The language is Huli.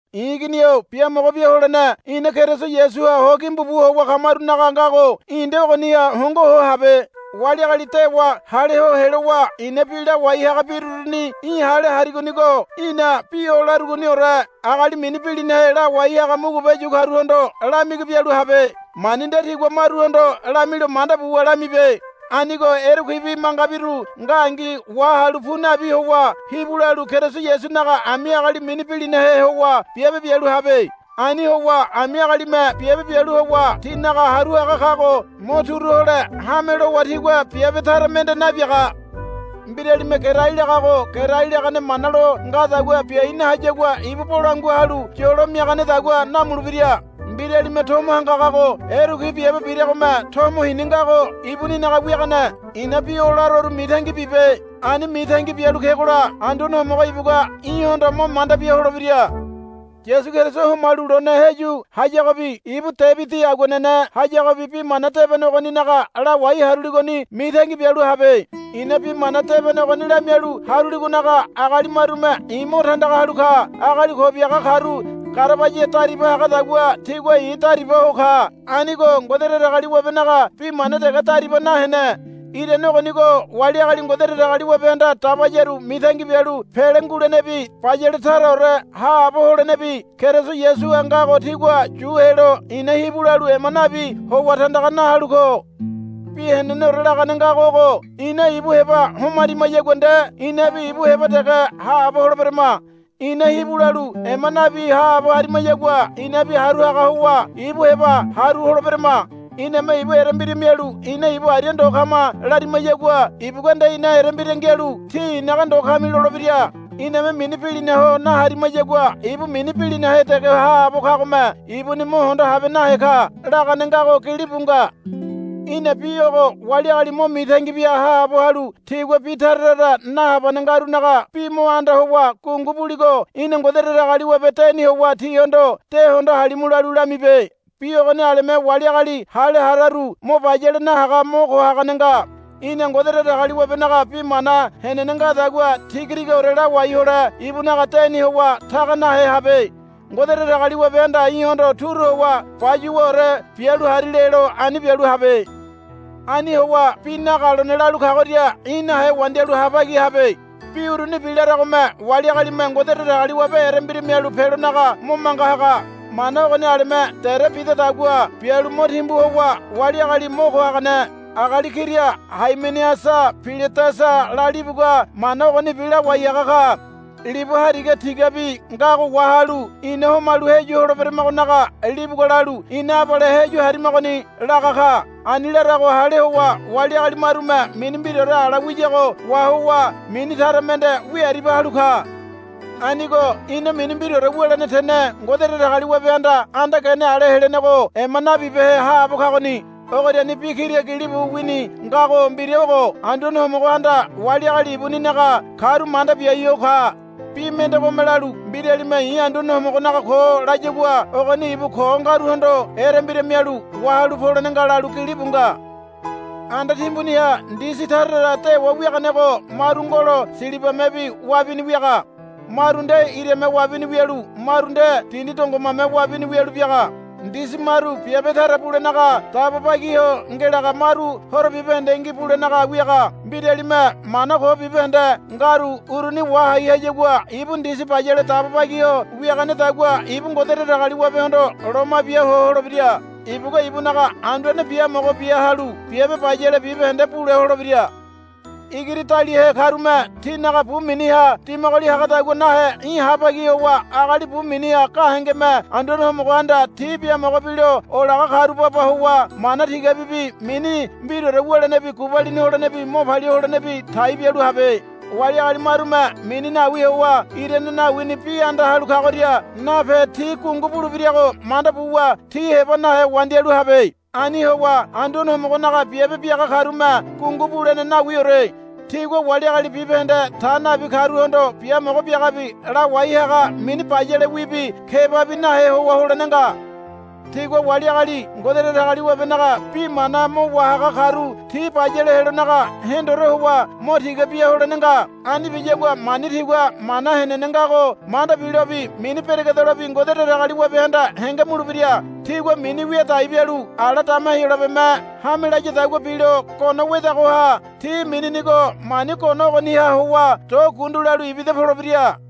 I̱ igini-o biamogo bia holene ina Keriso Yasuha ho gimbu bu howa kamarunaga ngago í̠ nde ogoniha hongo ho habe. Wali agali dewa hale ho helowa i̱na bi lawai haga biruruni í̠ hale harigonigo í̠na bi o larugoniore agali mini bilinahe lawai haga mugube yu karuhondo lamigi bialu habe. Mani nde tigua maruhondo lamilo manda buwa lamibe. Anigo erekuibi mangabiru ngangi wahalu pu nabi howa hibu lalu Keriso Yasunaga ami agali mini bilinahe howa biabe bialu habe. Ani howa ami agalime biabe bialu howa tinaga haru haga kago mo turu hole hame lowa tigua biabe tara mende nabiaga. Mbiralime gerai lagago gerai langane mana lo ngadagua biai nahayagua ibu bolangua halu yolo miaganedagua namulebira. Mbiralime tomo hangagago erekui biabe biragome tomo hini ngago ibuninaga wiagane. I̱na bi o laroru mitangi bibe. Ani mitangi bialu kegola Anduane Homogo ibugua í̠hondo mo manda bia holebira. Yasu Keriso homalu lone heyu hayagobi ibu Debidi aguanene hayagobi Bi Mana Debene ogoninaga lawai haruligoni mitangi bialu habe. I̱na Bi Mana Debene ogoni lamialu haruligonaga agali marume i̱ mo tandaga halu ka. Agali ko biaga karu garabaya dariba hagadagua tigua i̱ dariba ho ka. Anigo Ngode Datagaliwabenaga bi mana dege dariba nahene. Irane ogonigo wali agali Ngode Datagaliwabehanda dabayaru mitangi bialu pele ngulenebi bayale taraore haabo holenebi Keriso Yasuha ngago tigua yu helo i̱na hibu lalu ema nabi howa tandaga na halu ko. Bi heneneore lagane ngago ogo Ina ibu heba homarimayagua nde inabi ibu heba dege haabo holeberama. Ina hibu lalu ema nabi haabo harimayagua inabi haru haga howa ibu heba haru holeberama. Iname ibu erembira mialu ina ibu aria ndo kama larimayagua ibugua nde ina erembira ngialu, Tí i̱naga ndo kami, lolebira. Iname mini bilinaho naharimayagua ibu mini bilinahe dege haabo kagome ibuni mo hondo habe nahe ka. lagane ngago gilibu nga. Í̠na bi ogo wali agali mo mitangi bia haabo halu tigua bi tara tara nahabane ngarunaga bi mo anda howa gungu buligo í̠na Ngode Datagaliwabe deni howa tihondo, De hondo halimu, lalu lamibe. Bi ogoni aleme wali agali hale hararu mo bayale nahaga mo ko hagane nga. Í̠na Ngode Datagaliwabenaga bi mana henene ngadagua tigatigaore lawai hole ibunaga deni howa taga nahe habe. Ngode Datagaliwabehanda í̠hondo turu howa, Bayuwaore bialu hari, lelo ani bialu habe. Ani howa bi nagalone lalu kagoria í̠ nahe wandialu habagi habe. Bi urunibi laragome wali agalime Ngode Datagaliwabe erembira mialu pelonaga mo manga haga. Mana ogoni aleme dere bidadagua bialu mo timbu howa wali agali mo ko hagane. Agali kira Haimeneasa Piledasa lalibugua mana ogonibi lawai haga ka. Libu hariga tigabi ngago wahalu ina homalu heyu holeberamagonaga libugua lalu, Ina abale heyu harimagoni, laga ka. Ani larago hale howa wali agali marume mini mbiraore ala wiyago wahowa mini tara mende wiaribia halu ka. Anigo ina mini mbiraore wulene tene Ngode Datagaliwabehanda anda gene ale helenego ema nabibehe haabo kagoni. Ogoriani bi kira gilibu wini ngago mbira ogo, Anduane Homogohanda wali agali ibuninaga karu manda biai ho ka. Bi mendegome lalu, Mbiralime i̱ Anduane Homogonaga ko, layagua ogoni ibu ko ngaruhondo erembira mialu wahalu polene nga, lalu gilibu nga. Anda timbuniha ndisi tara tara dewa wiaganego maru ngolo silibamebi wabini wiaga. Maru nde irame wabini wialu maru nde dindi dongomame wabini wialu biaga. Ndisi maru biabe tara bulenaga dabo bagi ho ngelaga maru horo bibahendengi bulenaga wiaga. Mbiralime mana ko bibahende ngaru uruni wahai hayagua ibu ndisi bayale dabo bagi ho wiaganedagua ibu Ngode Datagaliwabehondo loma bia ho holebira. Ibugua ibunaga Anduane biamogo bia halu biabe bayale bibahende bule holebira. Igiri daliahe karume tinaga bu miniha dimagoli hagadagua nahe í̠ habagi howa agali bu miniha gahengeme Anduane Homogohanda ti biamogo bilo olaga karu baba howa mana tigabibi mini mbiraore wulenebi gubalini holenebi mo palia holenebi tai bialu habe. Wali agali marume mini nawi howa irane nawini bi anda halu kagoria nape ti gungu bulebirago manda buwa ti heba nahe wandialu habe. Ani howa Anduane Homogonaga biabe biaga karume gungu bulene nawiore. Tigua wali agali bibahende ta nabi karuhondo biamogo biagabi lawai haga mini bayalewibi kebabi nahe howa holene nga. Tigua wali agali Ngode Datagaliwabenaga bi mana mo wahaga karu ti bayale helonaga hendore howa mo tiga bia holene nga. Ani biyagua mani tigua mana henene ngago manda bilobi mini beregedelobi Ngode Datagaliwabehanda henge mulebira. Tigua mini wia dai bialu ala dama Heyolabeme hame layadagua bilo gono wedagoha ti mininigo mani gono ogoniha howa do gundu lalu ibida polebira.